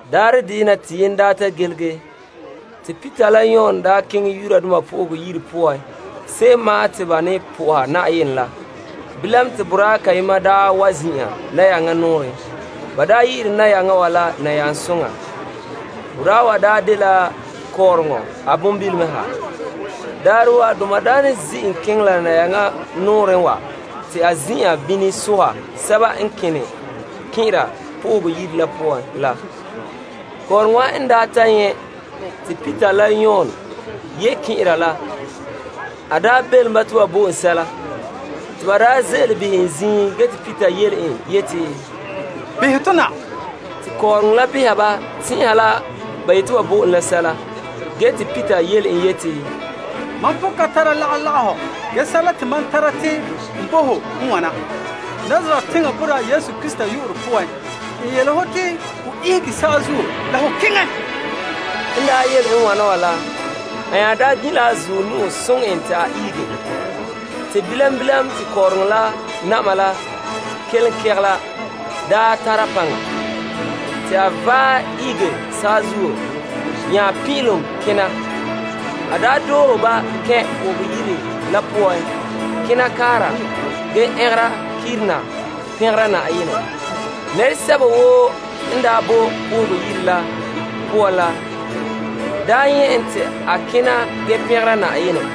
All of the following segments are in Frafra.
Daarɛ deyena te yenɛ daa ta gilige wontɛŋa te Peter la Yon keŋɛ Yenɛ Yire poan se'em ma'an te ba ne po'oha Yenɛ la. Bilam te boraa kayema wa zin'an nayaŋa nɔɔrɛ. Ba daa yi'ire nayaŋa wa la Nayaŋsoŋa. Boraa wa daa dela kɔɔrɔŋɔ a bonbilom ha. Daarɛ woo a doma daa ne zi' en keŋɛ la nayaŋa nɔɔrɛn wa te a zin'an bini soha sɛba n kena kɛn'ɛra Yenɛ Yire la poan la. Kɔɔrɔŋɔ wa n ta nyɛ' te Peter la Yon ye kɛn'ɛra la, a belom ba te ba bo en sɛla. Te ba ze'ele behɛ en ziin ge te Peter yele en yeti, Behɛ to na. Te kɔɔrɔŋɔ la beha ba tɛn'ɛha la ba yete ba bo en la sɛla. Ge te Peter yele en yeti, Mam pon ka tare lagahɔ ge sɛla te mam tara te n bo ho n wana: Nazaret teŋa boraa Yesu Krista yu'urɛ poan, n yele ho te ho ihege saazuo la ho keŋɛ. N daa yele n wana wa la, a nya gin' la a zuɔ nu'o soŋɛ en te a ihege. Te bilam bilam te kɔɔrɔŋɔ la na'ma la kinkigela tara paŋa. Te a vaɛ ihege saazuo nya pin'ilom kena doohe ba kɛn' Yenɛ Yire la poan kena kaara ge ɛngera kirina pɛngera Yenɛ. Nɛresɛba woo n bo Yenɛ Yire la poan la daa nyɛ' en te a kena ge pɛngera Yenɛ.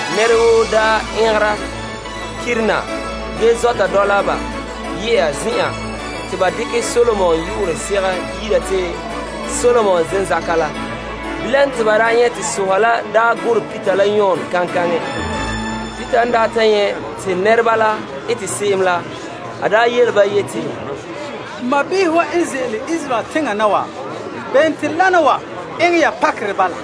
Bala te, nɛra woo zɔta dɔla ba ye'a zen'an te ba yi'ira te Solomon Zenzaka la. Bilam te ba nyɛ' te soha la gurɛ Peter la Yon kaŋkaŋɛ. Peter n daa ta nyɛ' te nɛreba la ete se'em la, a yele ba yeti, N sɔɔnrɔ n ze'ele Israel teŋa na wa, bene te wana wa eŋɛ ya pakerɛ bala?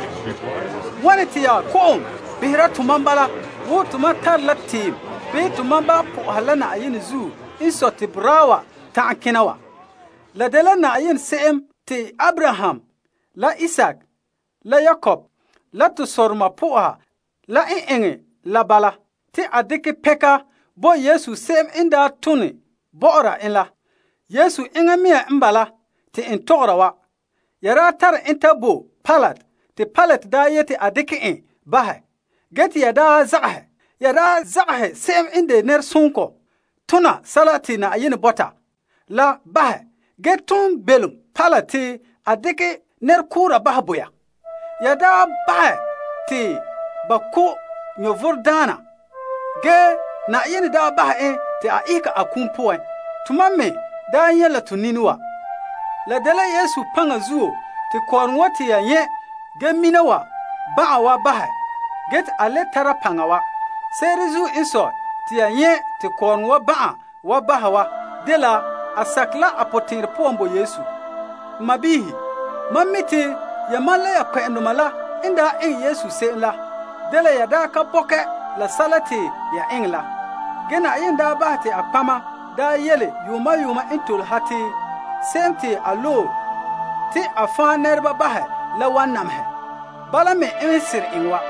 Wane te ya kɔ'ɔn behera tɔ bala wo tomam tare la tiim bii tomam ba' po'oha la Yenɛ zuo n sɔe te boraa wa tana kena wa? La dela Yenɛ se'em te Abraham la Isaak la Yakob la to sɔdoma po'oha la n eŋɛ la bala te a dekɛ pɛnka bo Yesu n a bia la, daa tone bɔ'ɔra en la. Yesu enŋa mea n bala te n tɔgɔra wa. Ya daa tare en ta bo Pilate te Pilate daa yete a dekɛ en bahɛ, ge te ya daa zagahɛ. Ya daa zagahɛ se'em n de fa'a la nɛresoŋɔ ge ton belom Pilate te a dekɛ nɛrekoora bahɛ bo ya. Ya bahɛ te ba ko' vomdaana, ge Yenɛ daa bahɛ en te a ihege a kum poan. Tomam me daa nyɛ' la to nini wa. La dela Yesu paŋa zuo te kɔɔrɔŋɔ wa te ya nyɛ' ge mina wa ban'an wa bahɛ ge te a le tara paŋa wa. Se'ere n sɔe te ya nyɛ' te kɔɔrɔŋɔ wa ban'an wa bahɛ wa dela a sakɛ la a potɛn'ɛrɛ poan bo Yesu. N sɔɔnrɔ, mam mi' te yamam la ya kpɛ'ɛndoma la n daa eŋɛ Yesu se'em la dela ya daa ka bɔkɛ la sɛla te ya eŋɛ la. Ge Yenɛ daa bahɛ te a nɔtɔgɔheba daa yele yuuma yuuma n tole ha te Se'em Te A Loe La wan nyɛ namehegɔ. Bala me n seren eŋɛ wa.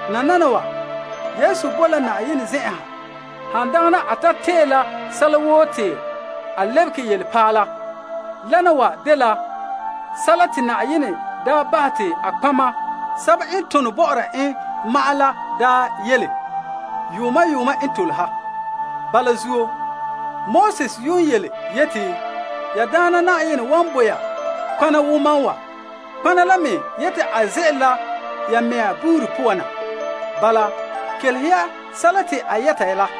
Nananawa, Yesu boe la Yenɛ zen'en han dagana a ta tee la sɛla woo te a lebege yelepaala. Wana wa dela sɛla te Yenɛ daa bahɛ te a nɔtɔgɔheba sɛba n tone bɔ'ɔra en ma'an la daa yele yuuma yuuma n tole ha. Bala zuo, Moses yuun yeti, Na'ayenɛ ya Yenɛ la wan loe nɔtɔgɔha n ane wo mam la ya mɛŋa sɔɔnrɔ wa poan. Kelehe ya en.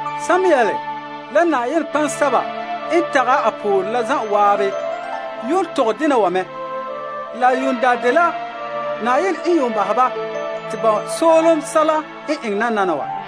Samuel la nɔtɔgɔheba sɛba n ta' pore a zan'an yuun tɔgɛ dena wa mɛ. La yuun daa dela Yenɛ n yuun bahɛ ba te ba soolom sɛla n eŋɛ nananawa.